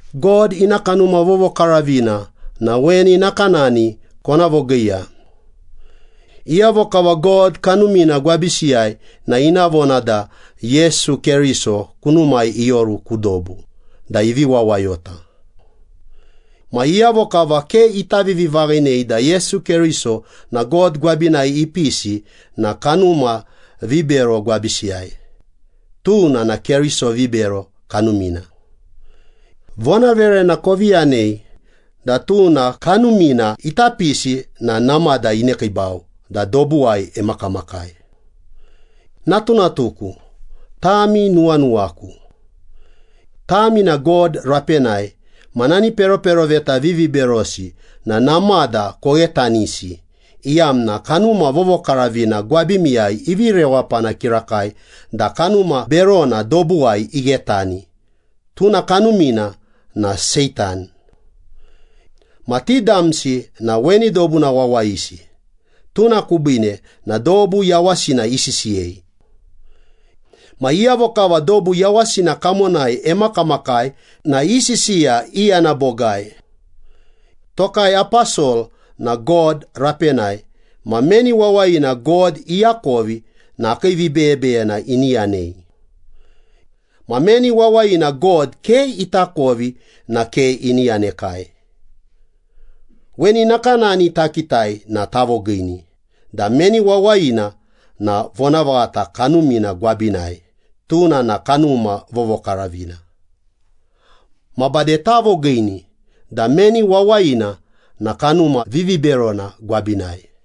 God ina Kanuma Vovokaravina na weni nakanani kona vogiiya. Iyavo kava God Kanumina gwabisiyai na ina vona da Yesu Keriso kunumai ioru ku dobu da ivi wawayota. Ma iyavo kava ke ita vivivaghinei da Yesu Keriso na God gwabinai ipisi na kanuma vibero gwabisiyai, tuna na keriso vibero kanumina. Vonaverena kovi yanei da tuna kanumina ita pisi na namada inekiibau da dobuwai emakamakai. Natunatuku, tami nuwanuwaku. Tami na God rapenai ma nani peroperoveta viviberosi na namada koghetanisi, iyamna Kanuma Vovokaravina gwabimiyai ivi rewapana kirakai da kanuma berona dobuwai ighetani, tuna kanumina na Seitan. Ma ti damsi na weni dobuna wawayisi, tuna kubiine na dobu yawasina isisiyei. Ma iyavo kava dobu yawasina kamonai emakamakai na i sisiya iyana bogai. Tokai aposol na God rapenai ma meni wawayina God iakovi na akii vibeyebeyena ini yanei. Ma meni wawayina God ke itakovi na ke ini yanekai. Weni nakanani takitai na tavogiini da meni wawayina na Vonavaghata Kanumina gwabinai, tuna na Kanuma Vovokaravina. Ma bade tavogiini da meni wawayina na kanuma viviberona gwabinai.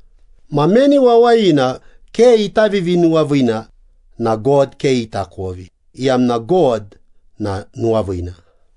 Ma meni wawayina ke ita vivinuwaviina na God ke itakovi, iyamna God na nuwaviina.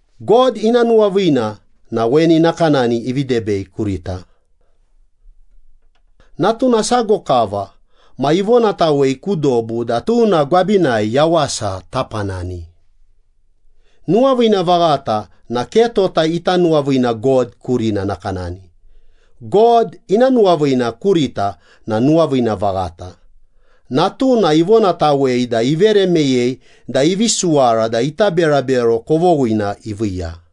God ina nuwaviina na weni nakanani ivi debei kurita. Natuna sago kava ma ivonatawei ku dobu da tuna gwabinai yawasa tapanani. Nuwaviina vaghata na ke tota ita nuwaviina God kurina nakanani. God ina nuwaviina kurita na nuwaviina vaghata. Natuna ivonatawei da ivere meyei da ivi suwara da ita berabero kovoghina iviiya.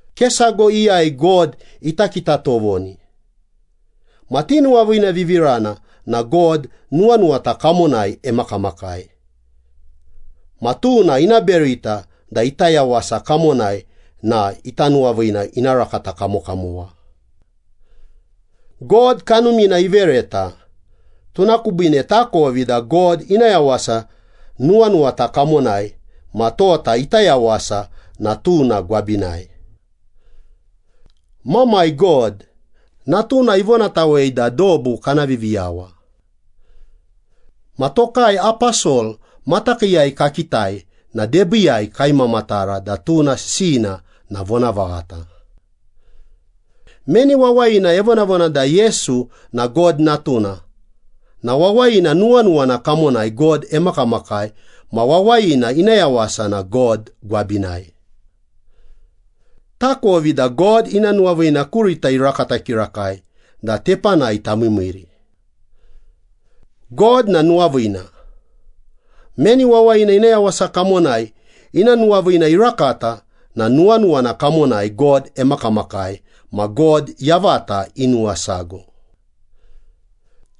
Ke sago iyai God ita kita tovoni. Ma tinuwaviinavivirana na God nuwanuwata kamonai emakamakai. Ma tuna ina berita da ita yawasa kamonai na ita nuwaviina ina rakata kamokamowa. God Kanumina ivereta, tuna kubiine takovi da God ina yawasa nuwanuwata kamonai ma tota ita yawasa na tuna gwabinai. Mamai God, Natuna ivonatawei da dobu kana Viviyawa. Ma tokai aposol matakiiyai kakitai na debiiyai kaimamatara da tuna sisiyina na vonavaghata. Meni wawayina evonavona da Yesu na God Natuna, na wawayina nuwanuwana kamonai God emakamakai ma wawayina ina yawasa na God gwabinai. Takovi da God ina nuwaviina kurita irakata kirakai da tepanai tamiimiiri. God na nuwaviina. Meni wawayina ina yawasa kamonai ina nuwaviina irakata na nuwanuwana kamonai God emakamakai, ma God yavata inuwasago.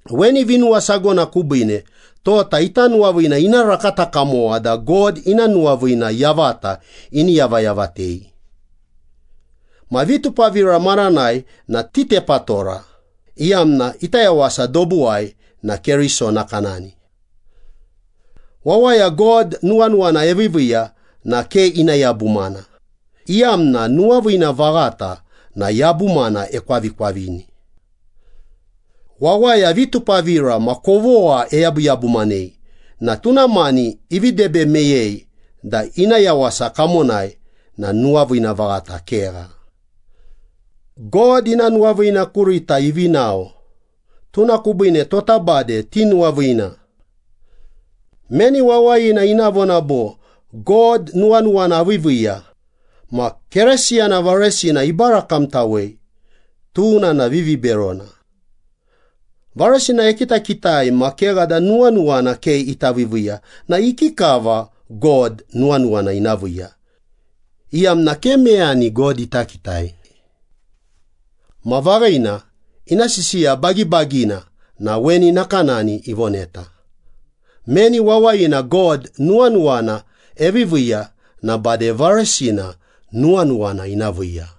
Weni vinuwasagona kubiine tota ita nuwaviina ina rakata kamowa da God ina nuwaviina yavata ini yavayavatei. Ma vitupavira maranai na titepatora, iyamna ita yawasa dobuwai na Keriso nakanani. Wawaya God nuwanuwana eviiviiya na ke ina yabumana, iyamna nuwaviina vaghata na yabumana ekwavikwavini. Wawaya vitupavira ma kovogha eyabuyabumanei na tuna mani ivi debe meyei da ina yawasa kamonai na nuwaviina vaghata kegha. God ina nuwaviina kurita ivi nao, tuna kubiine tota bade tinuwaviina. Meni wawayina ina vona bo, “God nuwanuwana aviiviiya,” ma Keresiyana varesina ibarakamtawei, tuna na viviberona. Varesina ekitakitai ma kegha da nuwanuwana ke ita viiviiya na ikikava God nuwanuwana ina viiya, iyamna ke meyani God ita kitai. Ma vaghina, ina sisiya bagibagina na weni nakanani ivoneta. Meni wawayina God nuwanuwana eviiviiya na bade varesina nuwanuwana ina viiya.